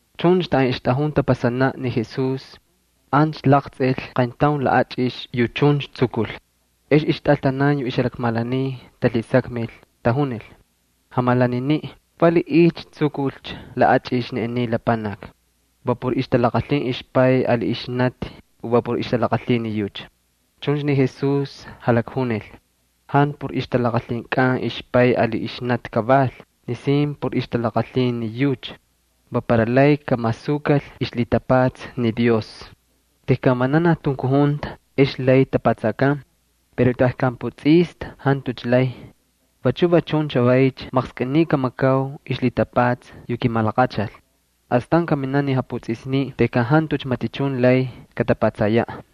Chuncha taꞌan ixtꞌajun tapasanaꞌ ni Jesús ancha laqtsꞌil qayntaun laꞌachꞌix yu chuncha tsukul. Ex ixtꞌaltanan yu ixjalakmalaniy talhisakmil, tajunil: —Jamalaniniꞌ, ¿valiꞌiycha tsukulcha laꞌachꞌix ni aniy lapanaki? ¿Va por ixtalaqalhin ixpay ali ixnati o va por ixtalaqalhin ni yucha? Chuncha ni Jesús jalakjunil: —Jantu por ixtalaqalhinkꞌan ixpay ali ixnati kaval, nisin por ixtalaqalhin ni yucha. Va para lay kamasukal ixlhitapatsa ni Dios. Tejkan vananaj tunkujunta ex lay tapatsakan pero tejkan putsꞌista jantucha lay. Vachu va chun chavaycha maqskꞌiniy kamakau ixlhitapatsa yu kimalaqachal. Astan kaminaꞌ ni japutsꞌisniꞌ tejkan jantucha matichun lay katapatsayaꞌ.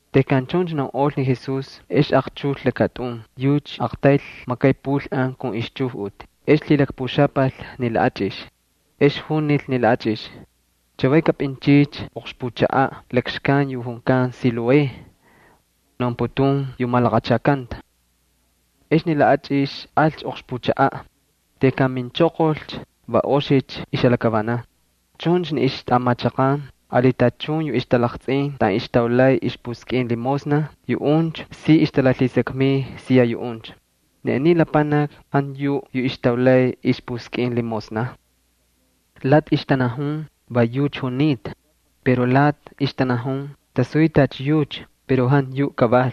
Tejkan chuncha naunꞌol ni Jesús, ex aqchujꞌul lakatꞌun. Aqtayl makay pulꞌan kun ixchujꞌuti ex lhilakpuxapal ni laꞌachꞌix. Ex junil ni laꞌachꞌix: —Chavay kapꞌinchꞌiycha oqxpuchaꞌaꞌ lakxkan yu junkan Siloé (yucha naunputun yu malaqachakanta). Ex ni laꞌachꞌix alcha oqxpuchaꞌaꞌ. Tejkan minchoqolcha va oxicha ixjalakavanan. Chuncha ni ixtꞌamachaqan ali tachun yu ixtalaqtsꞌin taꞌan ixtaulay ixpuskꞌin limosna, yuꞌuncha si ixtalalhisakmiy siya yuꞌuncha: —¿Ni aniy lapanaki jantu yuꞌ yu ixtaulay ixpuskꞌin limosna? Lati ixtanajun: —Va yucha junita. Pero lati ixtanajun: —Tasuy tacha yucha pero jantu yuꞌ kaval.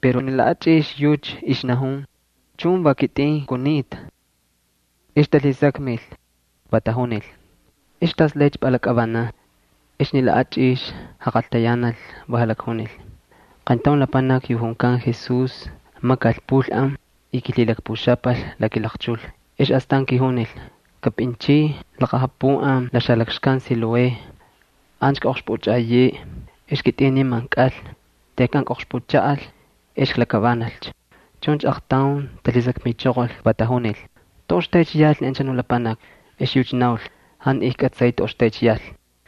Pero ni laꞌachꞌix yucha ixnajun: —Chun, va kitꞌin kunita. Ex talhisakmil va tajunil: —¿Ex tas laycha pꞌalakꞌavanan? Ex ni laꞌachꞌix jaqaltayanal, va jalakjunil: —Qayntaun lapanaki yu junkan Jesús makal pulꞌan y kilhilakpuxapal la kilaqchul, ex astan kijunil: “Kꞌapꞌinchꞌiy laqapuꞌan la xalakxkan Siloé, ancha kꞌaꞌoqxpꞌuchꞌaꞌayeꞌe.” Ex kitꞌin niman kꞌal. Tejkan kꞌoqxpuchaꞌal ex klakavanalcha. Chuncha aqtaun talhisakmichoqol, va tajunil: —¿Toꞌoxtaycha yal ni anchanu lapanaki? Ex yucha naul: —Jantu ijkꞌatsay toꞌoxtaycha yal.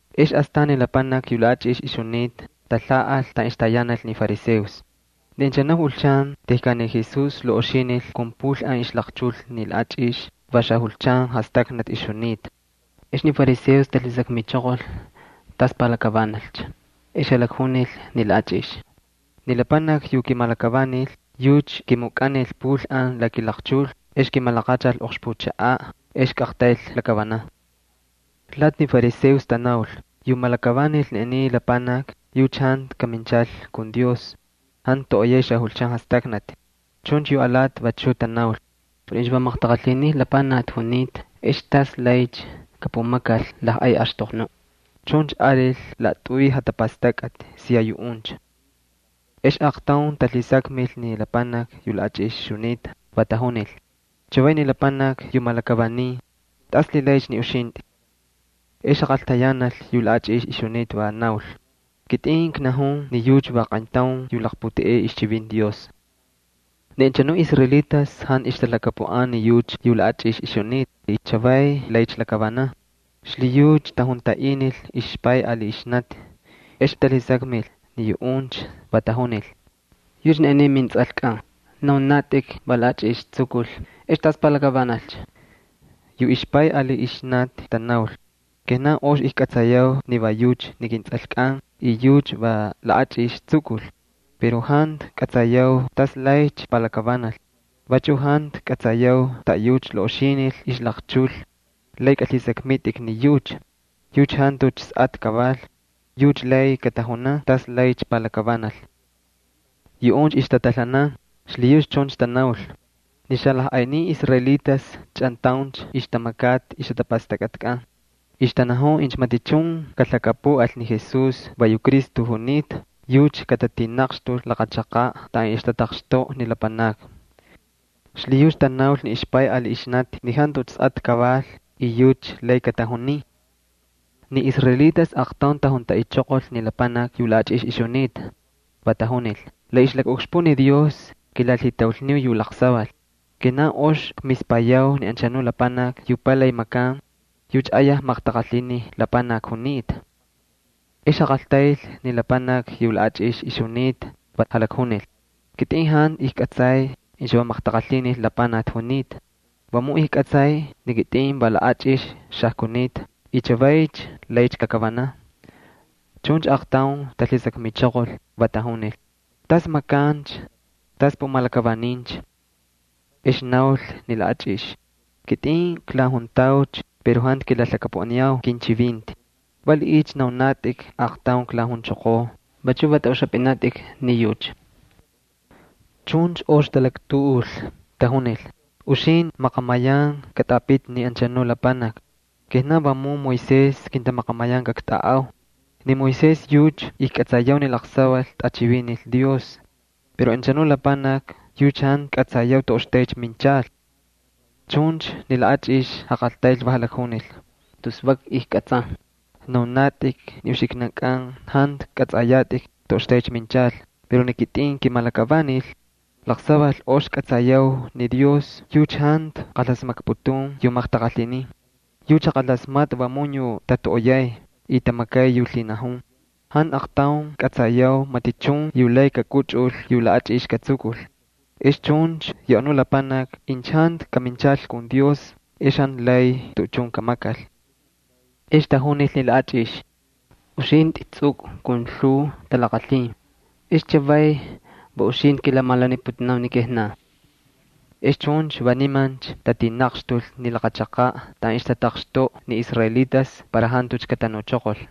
Ex astan ni lapanaki yu laꞌachꞌix ixjunita, talhaꞌal taꞌan ixtayanal ni fariseos. Ni anchanu julchan tejkan ni Jesús laꞌoxinil kun pulꞌan ixlaqchul ni laꞌachꞌix va xajulchan jastaknati ixjunita. Ex ni fariseos talhisakmichoqol tas palakavanalcha. Ex jalakjunil ni laꞌachꞌix: —Ni lapanaki yu kimalakavanil yucha kimukꞌanil pulꞌan la kilaqchul, ex kimalaqachal oqxpuchaꞌaꞌ, ex kꞌaqtayl klakavanan. Lati ni fariseos tanaul: —Yu malakavanil ni aniy lapanaki yucha jantu kaminchal kun Dios, jantu toꞌoyay xajulchan jastaknati. Chuncha yu alati vachu tanaul: —Pero incha va maqtaqalhini lapanaki junita, ¿ex tas laycha kapumakal lajꞌay axtoqnuꞌ? Chuncha alil laꞌatꞌuy jatapastakꞌati siya yuꞌuncha. Ex aqtaun talhisakmil ni lapanaki yu laꞌachꞌix ixjunita, va tajunil: —Chavay ni lapanaki yu malakavanin, ¿tas lhilaycha ni uxintꞌi? Ex jaqaltayanal yu laꞌachꞌix ixjunita, va naul: —Kitꞌin knajun ni yucha va qayntaun yu laqputeꞌey ixchivinti Dios. Ni anchanu israelitas jantu ixtalhakapuꞌan ni yucha yu laꞌachꞌix ixjunita y chavay laycha lakavanan. Xlhiyucha tajuntaꞌinil ixpay ali ixnati. Ixtalhisakmin ni yuꞌuncha, va tajunil: —¿Yucha ni aniy ni mintsꞌalkꞌan? Naunatꞌik ni va laꞌachꞌix tsukul. ¿Ex tas pulaycha lakavanan? Yu ixpay ali ixnati tanaul: —Kijnan ox ijkꞌatsayau ni va yucha ni kintsꞌalkꞌan y yucha va laꞌachꞌix tsukul. Pero jantu kꞌatsayau tas laycha palakavanal. Vachu jantu kꞌatsayau taꞌayucha laꞌoxinil ixlaqchul. Lay kꞌalhisakmitꞌik ni yucha. Yucha jantucha sꞌatꞌa kaval. Yucha lay katajunan tas laycha palakavanal. Yuꞌuncha ixtatalhanan, xlhiyucha chuncha tanaul. Ni xalajꞌaynin israelitas chꞌantauncha ixtamakata ixjatapastakꞌatkꞌan. Ixtanajun incha matichun kalhakapuꞌal ni Jesús va yu Cristo junita, yucha katatinaqxtul laqa chaqaꞌ taꞌan ixtataqxtoꞌa ni lapanakni. Xlhiyucha tanaul ni ixpay ali ixnati: Jantucha sꞌatꞌa kaval y lay kꞌalhisakmitꞌik ni yucha. Ni israelitas aqtaun tajuntaꞌichoqol ni lapanaki yu laꞌachꞌix ixjunita, va tajunil: —La ixlakaꞌukxpuꞌ ni Dios kilalhitaulniu yu laqsaval. Kijnan ox kmispayau ni anchanu lapanaki yu palay makan, yucha ayaj maqtaqalhini lapanaki junita. Ex jaqaltayl ni lapanaki yu laꞌachꞌix ixjunita, va jalakjunil: —Kitꞌin jantu ijkꞌatsay incha va maqtaqalhini lapanaki junita. Vamun ijkꞌatsay ni kitꞌin va laꞌachꞌix xajkunita y chavay laycha klakavanan. Chuncha aaqtaun talhisakmichoqol, va tajunil: —¿Tas makancha? ¿Tas pumalakavanincha? Ex naul ni laꞌachꞌix: —Kitꞌin klajuntaucha pero jantu kilalhakapuꞌaniu kinchivinti. ¿Valiꞌiycha naunatꞌik aaqtaun klajunchoqoo? ¿Vachu va tꞌaꞌuxapꞌinatꞌik ni yucha? Chuncha ox talaktuꞌul, va tajunil: —Uxintꞌi maqamayan katꞌapiti ni anchanu lapanaki. Kijnan vamun Moisés kintamaqamayan kaktꞌaꞌau. Ni Moisés yucha ijkꞌatsayau ni laqsaval tꞌachivinil Dios pero ni anchanu lapanaki yucha jantu kꞌatsayau toꞌoxtaycha minchal. Chuncha ni laꞌachꞌix jaqaltayl, va jalakjunil: —Tus vak ijkꞌatsan. Naunatꞌik ni uxiknankꞌan jantu kꞌatsꞌayatꞌik toꞌoxtaycha minchal, pero ni kitꞌin kimalakavanil. Laqsaval ox kꞌatsayau ni Dios yucha jantu qalasmakputun yu maqtaqalhinin. Yucha jaqalasmatꞌa vamun yu tatoꞌoyay y tamakay yu lhinajun. Jantu aqtaun kꞌatsayau matichun yu lay kakꞌuchꞌul yu laꞌachꞌix katsukul. Ex chuncha yu anu lapanaki incha jantu kaminchal kun Dios ex jantu lay tuꞌuchun kamakal. Ex tajunil ni laꞌachꞌix: —Uxintꞌi tsꞌukꞌu kun lhuu talaqalhin, ex chavay ¿va uxintꞌi kilamalaniputunau ni kijnan? Ex chuncha va nimancha tatinaqxtul ni laqa chaqaꞌ taꞌan ixtataqxtoꞌa ni israelitas para jantucha katanuchoqol.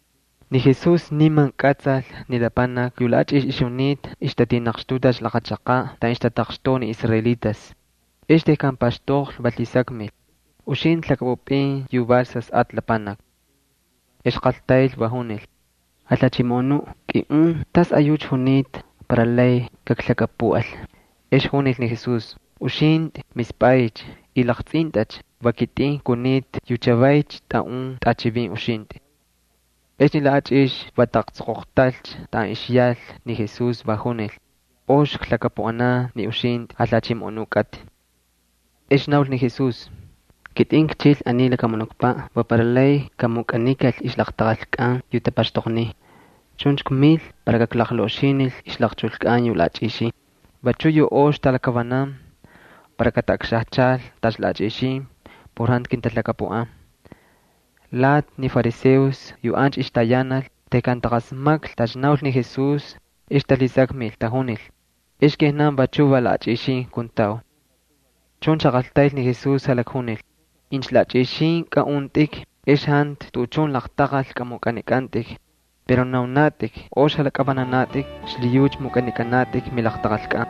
Ni Jesús niman kꞌatsal ni lapanaki yu laꞌachꞌix ixjunita ixtatinaqxtutacha laqa chaqaꞌ taꞌan ixtataqxtoꞌa ni israelitas. Ex tejkan paxtoqlhi va lhisakmil: —¿Uxintꞌi lhakꞌapꞌupꞌin yu val Sasꞌatꞌa Lapanaki? Ex qaltayl, va junil: —Jalhachimoꞌonuꞌ, kꞌiꞌun tasꞌayucha junita para lay kaklhakapuꞌal. Ex junil ni Jesús: —Uxintꞌi mispꞌaycha y laqtsꞌintꞌacha. Va kitꞌin kunita yu chavaycha ktꞌaꞌun tꞌachivin uxintꞌi. Ex ni laꞌachꞌix va taꞌaqtsoqoqtalcha taꞌan ixyal ni Jesús, va junil: —Ox klhakapuꞌanan ni uxintꞌi, Jalhachimoꞌonu kꞌatꞌi. Ex naul ni Jesús: —Kitꞌin kchil ni aniy lakamunukpaꞌ va para lay kamukꞌanikal ixlaqtaqalkꞌan yu tapaxtoqniy. Chuncha kmil para kaklaqlaꞌoxinil ixlaqchulkꞌan yu laꞌachꞌixin. Vachu yu ox talakavanan para kataꞌakxajchal tacha laꞌachꞌixin por jantu kintalhakapuꞌan. Lati ni fariseos yu ancha ixtayanal tejkan taqasmaklhi tacha naul ni Jesús ex talhisakmil, tajunil: —¿Ex kijnan vachuꞌ va laꞌachꞌixin kuntau? Chuncha jaqaltayl ni Jesús, jalakjunil: —Incha laꞌachꞌixin kaꞌuntꞌik, ex jantu tuꞌuchun laqtaqal kꞌamukꞌanikꞌantꞌik. Pero naunatꞌik ox jalakꞌavananatꞌik. Xlhiyucha mukꞌanikꞌanatꞌik milaqtaqalkꞌan.